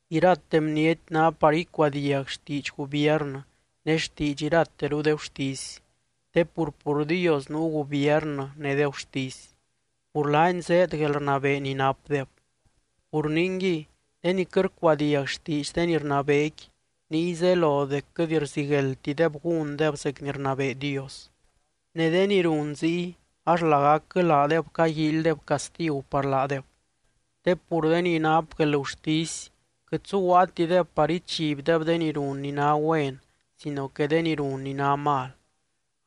Irate bniety ná par icuadiag xtiidx gubiernɨ ne xtiidx irateru de gurtisy. Te pur, pur Dios nuu gubiernɨ ne de gurtisy, pur laany zéed guelrnabee ni napdeb. Pur ningui, de ni quɨt rcuadiag xtiidx de ni rnabeequi, niy zelo dec quɨt rzigueldtideb gúndeb zec ni rnabee Dios. Ne de ni run ziy ax lagacquɨ laadeb caguíilydeb castigu par laadeb, te pur de ni nap guelgurtisy quɨt zuguaatideb par ichibdeb de ni run ni ná güen, sino que de ni run ni ná mal.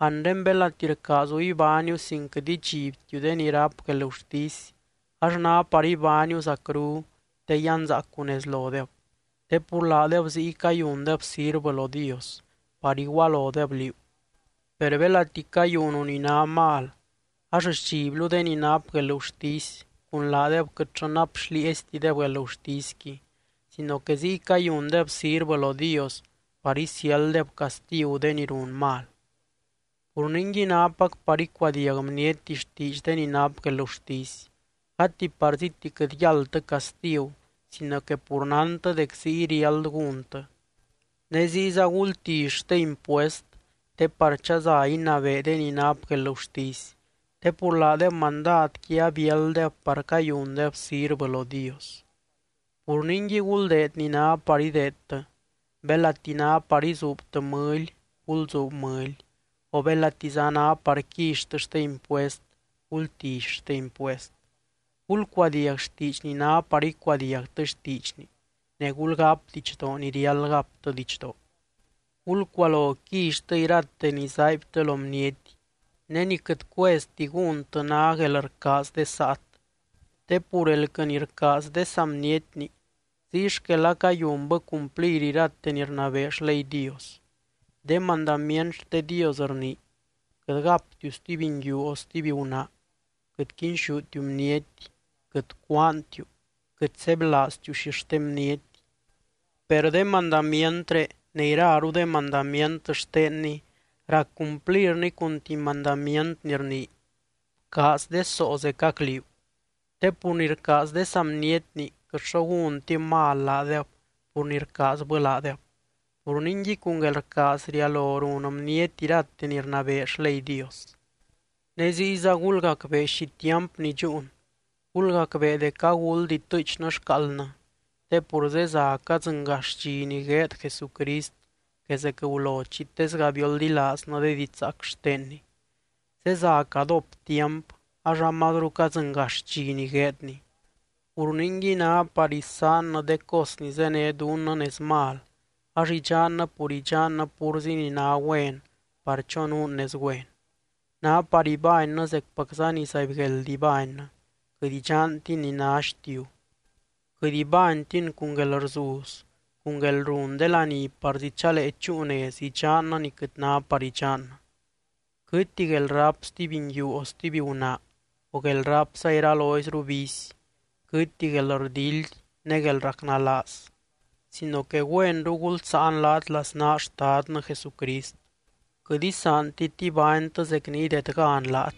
Anre belati rcaazu ibániu sin quɨt idxibtiu de ni ráp guelgurtisy, ax ná par ibániu zacru te yanzaacu nez lodeb. Te pur laadeb ziy cayundeb sirvɨ lo Dios par igualodeb liú. Per belati cayunu ni ná mal ax sdxiblu de ni nap guelgurtisy cun laadeb quɨtllɨ nap xlieeztideb guelgurtisqui, sino que ziy cayundeb sirvɨ lo Dios par isiálddeb castigu de ni run mal. Pur ningui nápac par icuadiag bniety xtiidx de ni nap guelgurtisy, gati parzíti quɨt yáldtɨ castigu sino que pur nántɨ dec ziy riáld gúntɨ. Ne ziyza gultilly xte impuest te par chaza inabee de ni nap guelgurtisy, te pur laadeb mandadqui abiálddeb par cayundeb sirvɨ lo Dios. Pur ningui guldeed ni ná par ideedtɨ, belati ná par izuubtɨ mɨly, gulzuub mɨly, o belatiza ná par quillytɨ xte impuest, gultilly xte impuest. Gulcuadiag xtiidx ni ná par icuadiagtɨ xtiidxni ne gulgáp didxdoo ni riáld gaptɨ didxdoo. Gulcualo quillytɨ irate ni zaaibtɨ lo bniety, ne ni quɨt cuezti gúntɨ ná guelrcaaz de saat. Te pur elquɨ ni rcaaz de saa bnietni ziy xquel acayunbɨ cumplir irate ni rnabee xley Dios. De mandamient xte Dios rnii: “Quɨt gaptiu stuby nguiu o stuby gunaa, quɨt quinxútiu bniety, quɨt cúaantiu, quɨt sebylaaztiu xixte bniety”, per de mandamientré ne iraru de mandamient xtenny rac cumplirni cun tuby mandamient ni rnii: “Bcaaz de soo zecac liú.” Te pur ni rcaaz de saa bnietni quɨt xo gúntib mal laadeb pur ni rcaazbɨ laadeb. Pur ningui cun guelrcaaz rialo run bniety irate ni rnabee xley Dios. Ne ziyza gulgacbee xi tiampni dxúun, gulgacbee dec aguld itɨɨchnɨ xcaaldnɨ. Te pur zeza cadzɨngax dxi ni gueed Jesucrist que zec gulo chi tesga bioldilaaznɨ de didxzaac xtenny. Zeza cadóp tiamp ax amazru cadzɨngax dxi ni gueedny, pur ningui ná par isaannɨ de cos ni zéne dunnɨ nez mal ax idxannɨ pur idxannɨ púrzi ni ná güen par chonuun nez güen. Ná par ibánnɨ zecpacza ni zaibgueld ibánnɨ, quɨt idxantin ni ná xtiu. Quɨt ibánytin cun guelrzuz, cun guelrun de laní parzi chalee chúu nez idxannɨ ni quɨt ná par idxannɨ. Quɨtti guelráp stuby nguiu o stuby gunaa o guelrápza iraloizru vicy, quɨtti guelrdildy ne guelracnalaaz. Sino que güenru gulsáan laat laznaa Xtadnɨ Jesucrist, quɨt isaantit ibánytɨ zec ni idedgan laat.